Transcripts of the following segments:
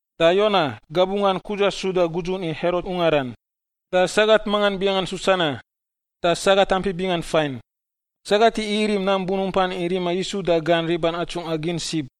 da Yowana — gabunggan Kudza suda gudzun i Herot ungaran — da sagat mangan binganggan Susana, da sagat ampi bingan fain. Sagat igi irim nam bunumpan i rima Yisu da gan riban atsungꞌa gin sib.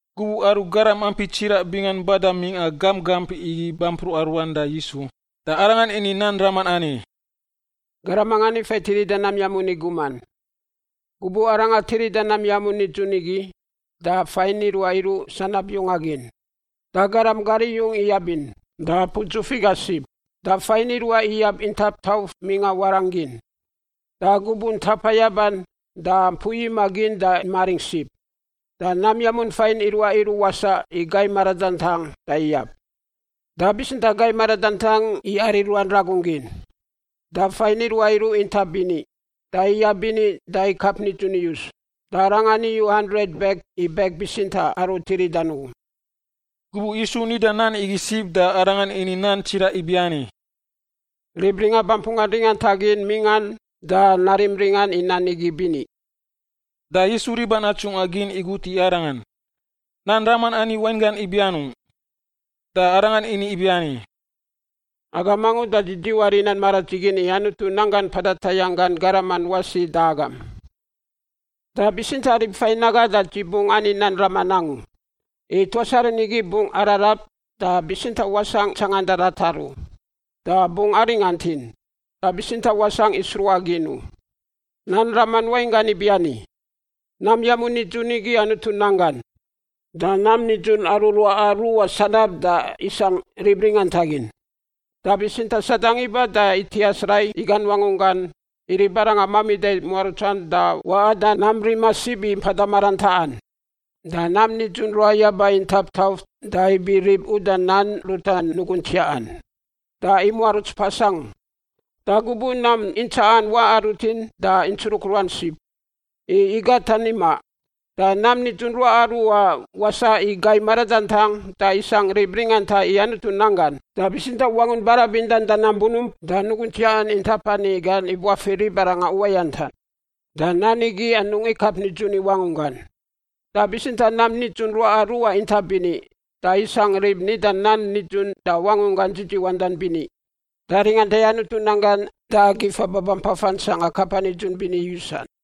Gubuꞌ aru garam ampi tsiraꞌ bingan bada mingꞌa gamp gamp igi bampruꞌa ruan da Yisu, da Arangan ini nan raman ani, “Garam mangan ifa i tirida nam yamun i guman. Gubuꞌ arangan tirida nam yamun nidzun igi, da fain iruaꞌ iruꞌ sanab yunga gin. Da garam gar iyung iyabin da apu dzuf iga sib. Da fain iruaꞌ iyab intap tauf mingꞌa warangꞌ gin, da gubuꞌ ntapa yaban da mpui imaꞌ gin da imaringꞌ sib. Da nam yamun fain iruaꞌ iruꞌ wasaꞌ i gai maradantang da iyab, da bitsintaꞌ gai maradantang iyari ruan ragun gin. Da fain iruaꞌ iruꞌ intap bini, da iyab bini da ikap nidzun iyus, da arangan iyu handret bek i bek bitsintaꞌ aru tiridan ugu.” Gubuꞌ Yisu nida nan igi sib da Arangan ini nan tsiraꞌ ibiani, “Rib ringa bampun gan ringantagin mingꞌan, da narim ringan i nan igi bini.” Da Yisu riban atsungꞌa gin igut i Arangan, “Nan raman ani wainggan ibi anungꞌ?” Da Arangan ini ibiani, “Agam angu da dzi dziwar i nan maradzigin i Anutu nanggan mpada tayangꞌ gan garaman wasi da agam, da bitsintaꞌ rib fain aga da dzi bungꞌ ani nan raman angu, i ‘tuas aru nigi bungꞌ ararab da bitsintaꞌ wasangꞌ tsanganda ratar u, da bungꞌ aringantin da bitsintaꞌ wasangꞌ i sruꞌa gin u.’ “Nan raman wainggan ibiani: Nam yamun nidzun igi Anutu nan gan. Da nam nidzun aru ruaꞌa ruꞌa sanab da isangꞌ rib ringantagin, da bitsintaꞌ Sadang iba da itias rai i gan wangunggan i ribarangan mamida i muarutsan da waꞌan da nam rima sib i mpada marantaꞌan. Da nam nidzun ruꞌa yaba intap tauf da ibi rib uda nan ruta nugun tsiaꞌan, da imuaruts pas angu. Da gubuꞌ nam intsaꞌan waꞌa rutin da intsruk ruan sib, i igatan imaꞌ. Da nam nidzun ruaꞌa ruꞌa wasaꞌ i gai maradantang da isangꞌ rib ringanta i Anutu nan gan, da bitsintaꞌ wangun barabindan, da nam bunump, da nugun tsiaꞌan intap ani gan ibuafir ribarangan uwayantan. Da nan igi anungꞌ ikap nidzun i wangunggan. Da bitsintaꞌ nam nidzun ruaꞌa ruꞌa intap bini, da isangꞌ rib nida nan nidzun da wangunggan dzidziwandan bini da ringanta i Anutu nan gan da gifa babampafan sangꞌa kapa nidzun bini yusan.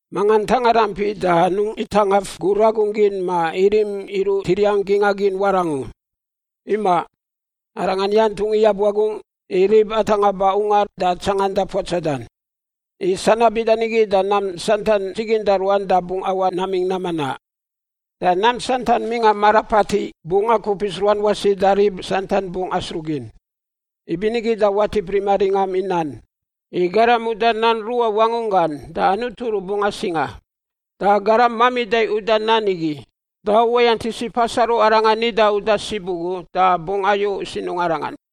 “Manga ntanga rampi da anungꞌ itangaf gur ragun gin ma irim iruꞌ tiriang gingꞌa gin warangꞌ u. Imaꞌ, arangan yantungꞌ iyab wagungꞌ i rib atangꞌa ba ungar da tsanganda puatsadan. I sanab bida nigi da nam santan dziginda ruan da bungꞌ awaꞌ namingꞌ nam manaꞌ, da nam santan mingꞌa mara patiꞌ bungꞌ akupis ruan wasi da rib santan bungꞌ asruꞌ gin. Ibinigi da watip rima ringam i nan. I garam uda nan ruꞌa wangunggan da Anutu rubungꞌ asinga, da garam mamida uda nan igi da uwayant isiꞌ pas aru arangan nida uda sib ugu da bungꞌ ayu sinungꞌ arangan.”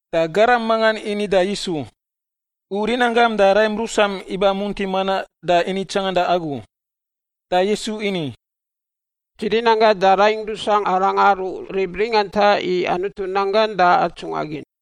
Da garam mangan ini da Yisu, “U rinanggam da raim rusam iba munti manaꞌ da ini tsanganda agu.” Da Yisu ini, “Dzi rinanggangꞌ da raingꞌ rusangꞌ aranga aru rib ringanta i Anutu nan gan da atsungꞌa gin.”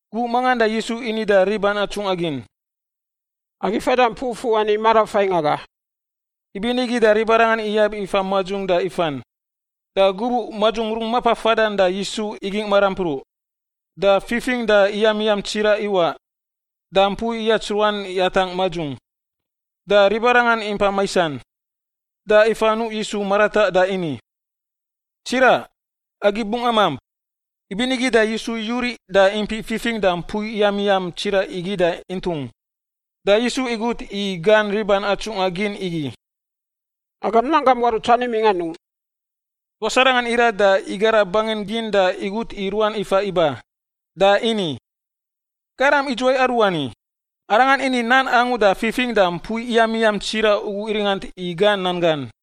Gubuꞌ mangan da Yisu ini da riban atsungꞌa gin, “Agi fada mpui fuꞌ ani marafaingꞌ aga.” Ibinigi da ribarangan iyab ifa madzung da ifan. Da gubuꞌ madzung rungꞌ mapa fadan da Yisu igingꞌ marampruꞌ. Da fifingꞌ da iyamiyam tsiraꞌ iwaꞌ, da mpui iyats ruan yatangꞌ madzung. Da ribarangan impa maisan. Da ifa nuꞌ Yisu marataꞌ da ini, “Tsiraꞌ, agi bungꞌ amamp!” Ibinigi da Yisu yuriꞌ da impiꞌ fifingꞌ da mpui iyamiyam tsiraꞌ igi da intung. Da Yisu igut i gan riban atsungꞌa gin igi, “Agam nanggam muarutsan imingꞌ anungꞌ?” Tuas arangan irat da igara bangin gin da igut i ruan ifa iba. Da ini, “Garam idzuwai aruani? Arangan ini nan angu da fifingꞌ da mpui iyamiyam tsiraꞌ ugu iringant i gan nan gan!”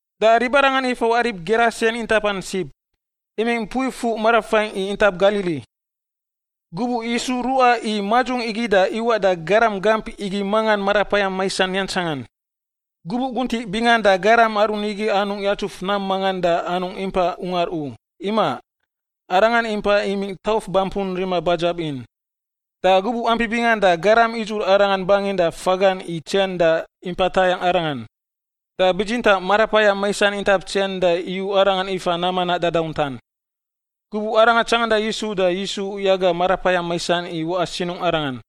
Da ribarangan ifawaꞌ rib Gerasen intapan sib, imingꞌ mpui fuꞌ marafaingꞌ i intap Galili. Gubuꞌ Yisu ruꞌa i madzung igi da iwaꞌ da garam gamp igi mangan marapayam maisan yantsangan. Gubuꞌ guntiꞌ bingan da garam aru nigi anungꞌ yatsuf nam mangan da anungꞌ impa ungar u; imaꞌ, arangan impai imingꞌ tauf bampun rima badzab in. Da gubuꞌ ampi bingan da garam idzur arangan bangin da fagan i tsen da impa tayangꞌ arangan. Da bitsintaꞌ marapayam maisan intap tsen da iyu arangan ifa nam manaꞌ dadauntan. Gubuꞌ arangan tsanganda Yisu da Yisu yaga marapayam maisan i waꞌa sinungꞌ arangan.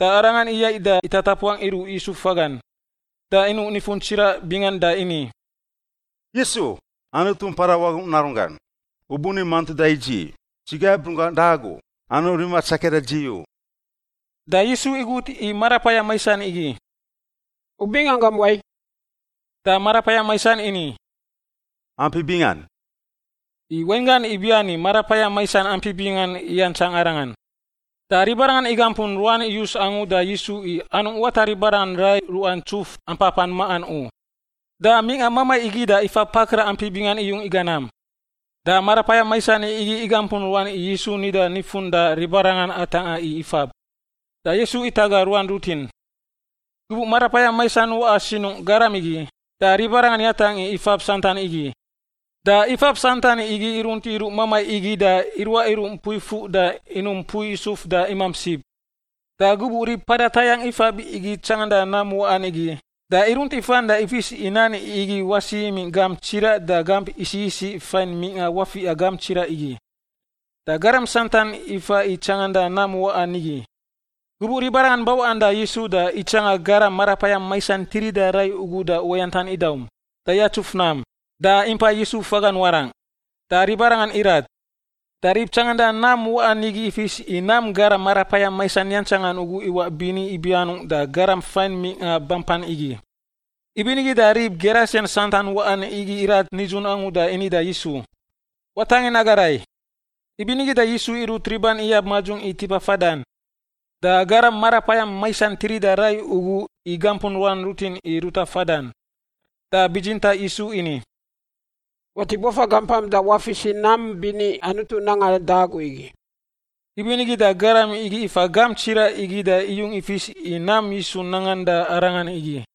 Da arangan iyaiꞌ da itatapuang iruꞌ Yisu fagan, da inuꞌ nifun tsiraꞌ bingan da ini, “Yisu, Anutu Mpada Wagungꞌ Narunggan, U buni mantuda i dzi? Dzi gaib runggangꞌ da Agu, anungꞌ rima tsakia da dzi u!” Da Yisu igut i marapayam maisan igi, “U binganggam wai?” Da marapayam maisan ini, “Ampi Bingan,” i wainggan ibiani marapayam maisan ampi bingan iyantsang arangan. Da ribarangan igampun ruan iyus angu da Yisu i anungꞌ wata ribarangan rai ruꞌa ntsuf ampapan maꞌan u. Da mingꞌa mamai igi da ifab pakraꞌ ampi bingan iyung iga nam. Da marapayam maisan igi igampun ruan i Yisu nida nifun da ribarangan atangꞌa i ifab. Da Yisu itaga ruan rutin. Gubuꞌ marapayam maisan waꞌa sinungꞌ garam igi, da ribarangan yatangꞌ i ifab santan igi. Da ifab santan igi irunt iruꞌ mamai igi da iruaꞌ iruꞌ mpu fuꞌ da inum mpui isuf da imamp sib. Da gubuꞌ rib mpada tayangꞌ ifab igi tsanganda nam waꞌan igi, da irunt ifan da ifis i nan igi wasi imingꞌ gamp tsiraꞌ da gamp isiꞌ isiꞌ fain mingꞌa wafiꞌa gamp tsiraꞌ igi. Da garam santan iba i tsanganda nam waꞌan nigi. Gubuꞌ ribarangan bawaꞌan da Yisu da itsanga garam marapayam maisan tirida rai ugu da uwayantan idaum, da yatsuf nam, da impai Yisu fagan warangꞌ, da ribarangan irat. Da rib tsanganda nam waꞌan nigi ifis i nam garam marapayam maisan yantsangan ugu iwaꞌ bini ibi anungꞌ da garam fain mingꞌa bampan igi. Ibinigi da rib Gerasen santan waꞌan igi irat nidzun angu da ini da Yisu, “Watangin aga rai.” Ibinigi da Yisu irut riban iyab madzung i tipa fadan. Da garam marapayam maisan tirida rai ugu igampun ruan rutin i ruta fadan, da bitsintaꞌ Yisu ini, “Watip wafa gampam da wafis i nam bini Anutu nangan da agu igi.” Ibinigi da garam igi ifa gamp tsiraꞌ igi da iyung ifis i nam Yisu nangan da arangan igi.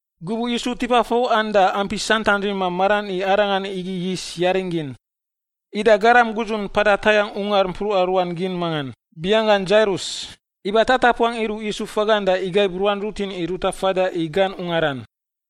Gubuꞌ Yisu tipa fawaꞌan da ampi santan rima maran i Arangan igi yis yaring gin. Ida garam gudzun mpada tayangꞌ ungar mpruꞌa ruan gin mangan, binganggan Dzairus, iba tatapuang iruꞌ Yisu fagan da igaib ruan rutin i ruta fada i gan ungaran.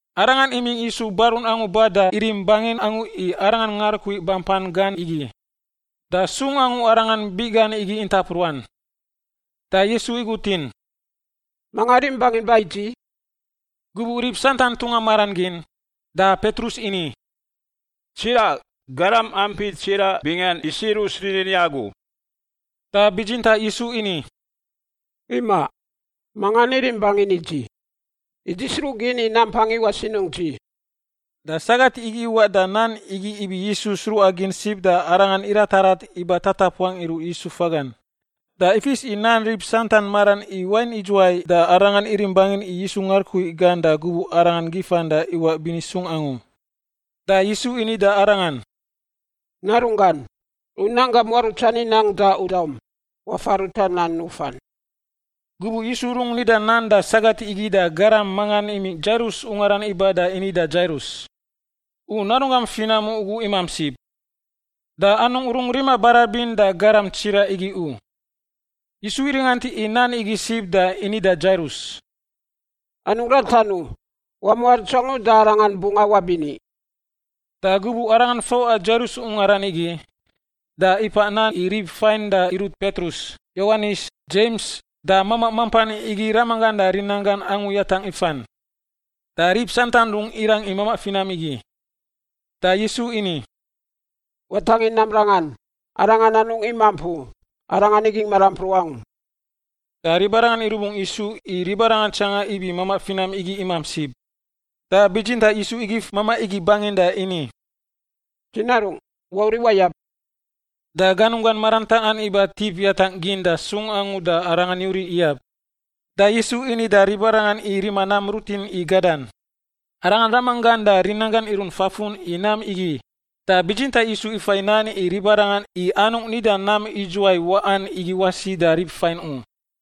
Arangan imingꞌ Yisu barun angu ba da irim bangin angu i Arangan ngarukui bampan gan igi, da sung angu arangan biꞌ gan igi intap ruan. Da Yisu igutin, “Manga rim bangin ba i dzi?” Gubuꞌ rib santan tunga maran gin, da Petrus ini, “Tsiraꞌ, garam ampi tsiraꞌ bingan isirus rinin i Agu.” Da bitsintaꞌ Yisu ini, “Imaꞌ. Mangan irim bangin i dzi, i dzi sruꞌgin i nampang iwaꞌ sinungꞌ dzi.” Da sagat igi iwaꞌ da nan igi ibi Yisu sruꞌagin sib da arangan iratarat iba tatapuang iruꞌ Yisu fagan. Da ifis i nan rib santan maran i wain idzuwai da arangan irim bangin i Yisu ngarukui gan da gubuꞌ arangan gifan da iwaꞌ bini sung angu. Da Yisu ini da arangan, “Narungꞌ, u nanggam muarutsan inang da u daum. Wafa ruta nan nufan.” Gubuꞌ Yisu rungꞌ nida nan da sagat igi da garam mangan imingꞌ Dzairus ungaran iba da ini da Dzairus, “U narunggam finam ugu imamp sib. Da anungꞌ rungꞌ rima barabin da garam tsiraꞌ igi u.” Yisu iringant i nan igi sib da ini da Dzairus, “Anungꞌ ratan u. Wamuaruts angu da arangan bungꞌ awaꞌ bini.” Da gubuꞌ Arangan fawaꞌa Dzairus ungaran igi, da ipaꞌ nan i rib fain da irut Petrus, Yowanis, Dzems, da mamaꞌ mampan igi ramanggan da rinanggan angu yatangꞌ ifan. Da rib santan rungꞌ irang i mamaꞌ finam igi. Da Yisu ini, “Watangin nam rangan. Arangan anungꞌ imamp u; arangan igingꞌ marampruꞌ angu.” Da ribarangan irubungꞌ Yisu i ribarangan itsanga ibi mamaꞌ finam igi mamp sib. Da bitsintaꞌ Yisu igif mamaꞌ igi bangin da ini, “Dzi narungꞌ, wauriꞌ wayab!” Da ganunggan marantaꞌan iba tip yatangꞌ gin da sung angu da arangan yuriꞌ iyab. Da Yisu ini da ribarangan i rima nam rutin i gadan. Arangan ramanggan da rinanggan irunt fafun i nam igi, da bitsintaꞌ Yisu ifai nan i ribarangan i anungꞌ nida nam idzuwai waꞌan igi wasi da rib fain u.